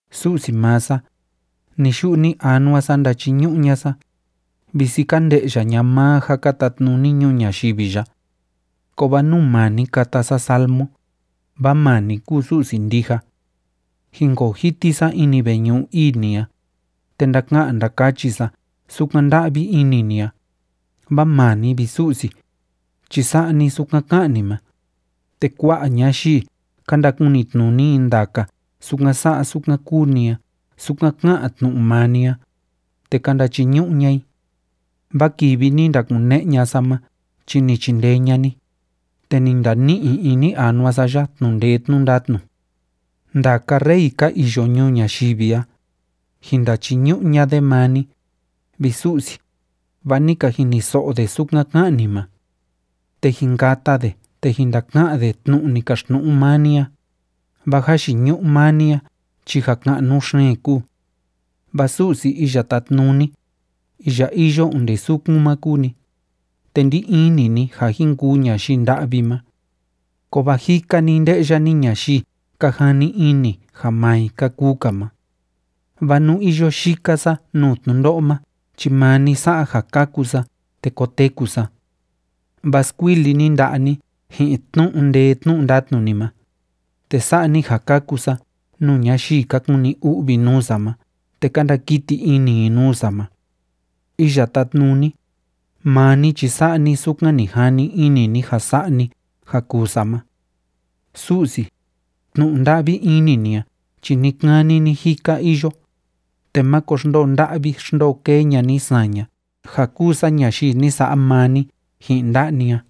Su'si maa sa, ni‑yu'u ni‑anua sa ndachiñu'u ña'a sa, visi ka nde'ya ña'a maa ja ka tatnuni ñuu ñayivi ya. Kovaa nuu maa ni kata sa salmo, vaa maa ni kúu Su'si ndija. Jinkoo jiti sa ini veñu'u ii ni a, te ndaka'an ndakachi sa sukan nda'vi ini ni a, vaa maa ni, vi Su'si, chi sa'a ni sukan ká'an ni ma, te kua'a ñayii, ka ndakunitnuni i ndaka sukan sa'a sukan kúu ni a sukan ká'an tnu'u maa ni a, te ka ndachiñu'u ña'a i. Vaa kivi ni ndakune'e ña'a sa ma chi ni chindee ña'a ni, te ni ndani'i ini anua sa ya tnu'u ndee tnu'u ndatnu. Ndaka rey ka iyo ñuu ñayivi a, jin ndachiñu'u ña'a de maa ni, vi Su'si, vaa ni ka jiniso'o de sukan ká'an ni ma. Te jin kata de te jin ndaka'an de tnu'u ni kaxtnu'u maa ni a, vaa jayiñu'u maa ni a chi ja ka'nu xeen kúu. Vaa Su'si Iya Tátnuni, iya iyo onde sukun ma kúu ni, te ndí ini ni ja jin kuu ñayii nda'vi ma. Kovaa jika‑ni nde'ya ni ñayii ka jani ini ja maa i ka kuu‑ka ma. Vaa nú iyo yika sa nuu tnundo'o ma chi maa ni sa'a ja kaku sa te koteku sa. Vaa skuili ni nda'a ni ji'in tnu'u ndee tnu'u ndatnu ni ma, te sa'a ni ja kaku sa nuu ñayii ka kuni u'vi nuu sa ma te ka ndakiti ini i nuu sa ma. Iya Tátnuni, maa ni chi sa'a ni sukan ni jani ini ni ja sa'a ni ja kuu sa ma. Su'si, tnu'u nda'vi ini ni a chi ni‑kani ni‑jika iyo, te máko xndoo nda'vi xndoo kee ña'a ni saña ja kúu sa ñayii ni sa'a maa ni ji'in nda'a ni a.